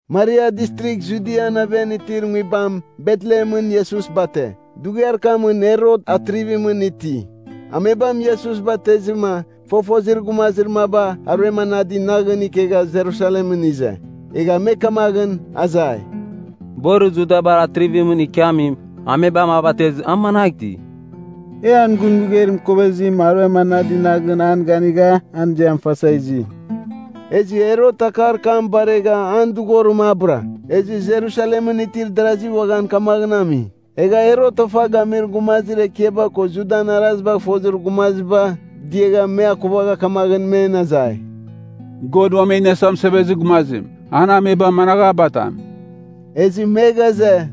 Maria Distrigh Judian aven itir nguibam Betlehemɨn Iesus bate. Dughiar kamɨn Herot, Atrivimɨn iti. Amebam Iesus batezɨma fofozir gumazir maba aruem anadi naghɨn ikegha Jerusalemɨn ize. Egha me kamaghɨn azai, “Borir Judabar Atrivimɨn ikiamim, amebam a batezɨ a managh iti? E an gun mɨgeir mɨkovezim aruem anadi naghɨn an ganigha an ziam fasa izi.” Ezɨ Herot akar kam baregha an dɨghorim a bɨra. Ezɨ Jerusalemɨn itir darazi uaghan kamaghɨn ami. Egha Herot ofa gamir gumazir ekiaba ko Judan arazibagh fozir gumazibar diagha me akuvagha kamaghɨn men azai, “God Uam E Iniasa Mɨsevezir Gumazim, an amebam managh a batam?” Ezɨ me ghaze,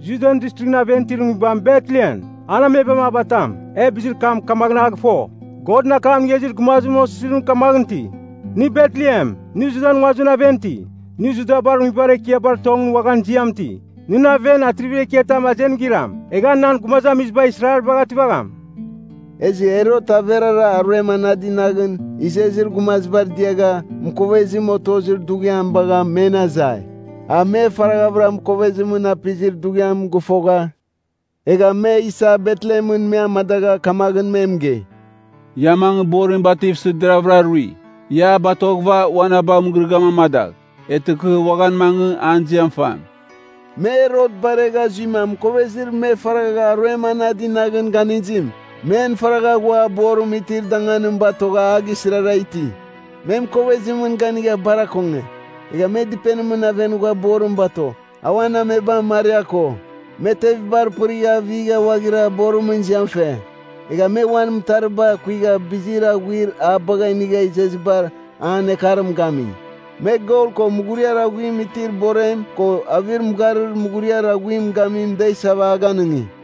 “Judian Distrighɨn aven itir nguibam Betlehemɨn, an amebam a batam. E bizir kam kamaghɨn a gɨfo, Godɨn akam inigha izir gumazimɨn osizirim kamaghɨn iti, ‘Nɨ Betlehem, nɨ Judan nguazimɨn aven iti. Nɨ Judabar nguibar ekiabar tongɨn uaghan ziam iti, nɨn aven atrivir ekiatam azenim giram, egh a nan gumazamiziba Israelbagh ativagham.’” Ezɨ Herot averara aruem anadi naghɨn izezir gumazibar diagha mɨkovezim otozir dughiam bagha men azai. A me faraghavɨra mɨkovezimɨn apizir dughiam gɨfogha, egha me isa Betlehemɨn me amadagha kamaghɨn me mɨgei, “Ia mangɨ borim bativsɨ deraghvɨra rui. Ia a batoghɨva ua na bagh mɨgɨrɨgɨam amadagh. Eghtɨ kɨ uaghan mangɨ, an ziam fam.” Me Herot baregha zuima mɨkovezir me faragha aruem anadi naghɨn ganizim, men faragha ghua borim itir danganim batogha a gisɨrara iti. Me mɨkovezimɨn ganigha bar akonge. Egha me dɨpenimɨn aven ghua borim bato, a uan amebam Maria ko. Me tevibar pɨrigha avigha ghuaghira borimɨn ziam fe. Egha me uan mɨtariba kuigha bizir aghuir a bagha inigha izezibar an ekarim gami. Me gol ko mughuriar aghuim itir borem ko avir mɨgharir muguriar aghuim gamim da isava a ganɨngi.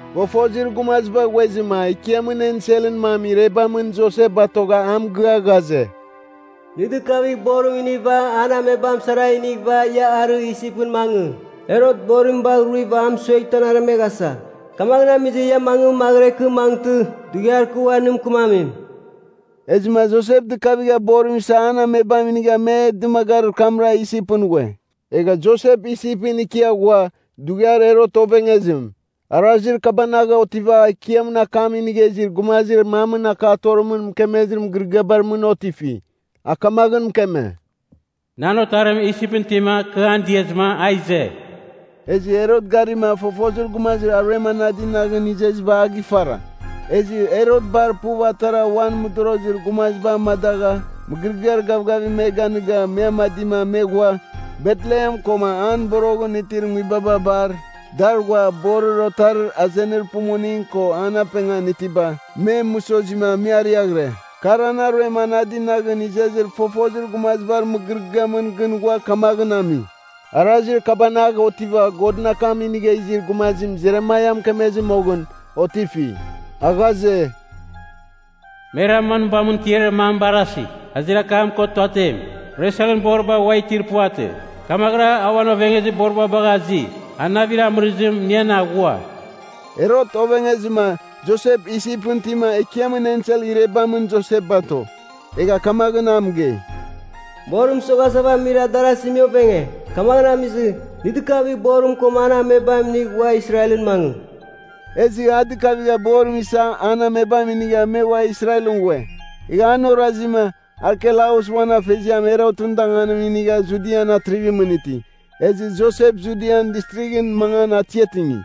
Fofozir gumaziba ghuezɨma Ekiamɨn enselɨn mam irebamɨn Josep batogha a mɨgɨa ghaze, “Nɨ dɨkavigh borim iniva an amebam sara inighɨva ia arɨ Isipɨn mangɨ. Herot borim bagh ruiva amɨsueghtɨ an aremeghasa. Kamaghɨn amizɨ ia mangɨ maghɨra ikɨ mangɨtɨ, dughiar kɨ ua nɨ mɨkɨmamim.” Ezɨma Josep dɨkavigha borim isa an amebam inigha me dɨmagarir kamra Isipɨn ghue. Egha Josep Isipɨn ikia ghua, dughiar Herot ovengezim. Arazir kabanagh otiva Ekiamɨn akam inigha izir gumazir mamɨn akatorimɨn mɨkemezir mɨgɨrɨgɨabar mɨn otifi. A kamaghɨn mɨkeme, “Nan Otarim Isipɨn itima kɨ an diazɨma a ize.” Ezɨ Herot garima, fofozir gumazir aruem anadi naghɨn izeziba a gifara. Ezɨ Herot bar puv atara uan mɨdorozir gumaziba amadagha, mɨgɨrɨgɨar gavgavim me ganɨga, me amadima me ghua, Betlehem koma an boroghɨn itir nguibaba bar dar ghua borir otarir azenir pumuning ko an apengan itiba, me mɨsozima me ariaghɨre. Kar ana aruem anadi naghɨn izezir fofozir gumazibar mɨgɨrɨgɨamɨn gɨn ghua kamaghɨn ami. Arazir kabanagh otiva Godɨn akam inigha izir gumazim Jeremaia mɨkemezɨ moghɨn, otifi. A ghaze, “Me Raman nguibamɨn tiarir mam barasi, azir akam ko tuatem. Reselɨn boriba ua itir puvatɨ. Kamaghɨra a uan ovengezir boriba bagha azi. An navir amɨrizim inian aghua.” Herot ovengezɨma, Josep Isipɨn itima, Ekiamɨn ensel irebamɨn Josep bato. Egha kamaghɨn a mɨgei, “Borim mɨsoghasa amir darazi me ovenge. Kamaghɨn amizɨ, nɨ dɨkavigh borim koma an amebam inigh ua Israelɨn mangɨ.” Ezɨ a dɨkavigha borim isa an amebam inigha me ua Israelɨn ghue. Egha an orazima, Arkelaus uan afeziam Herotɨn danganim inigha Judian Atrivimɨn iti. Ezɨ Josep Judian Distrighɨn mangan atiatingi.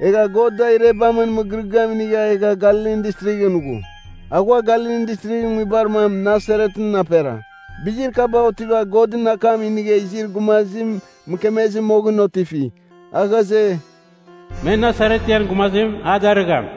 Egha God da irebamɨn mɨgɨrɨgɨam inigha egha Galilin Distrighɨn ghu. A ghua Galilin Distrighɨn nguibar mam, Nasaretɨn apera. Bizir kaba otiva Godɨn akam inigha izir gumazim mɨkemezɨ moghɨn otifi, a ghaze, “Me Nasaretian gumazim, a darɨgham.”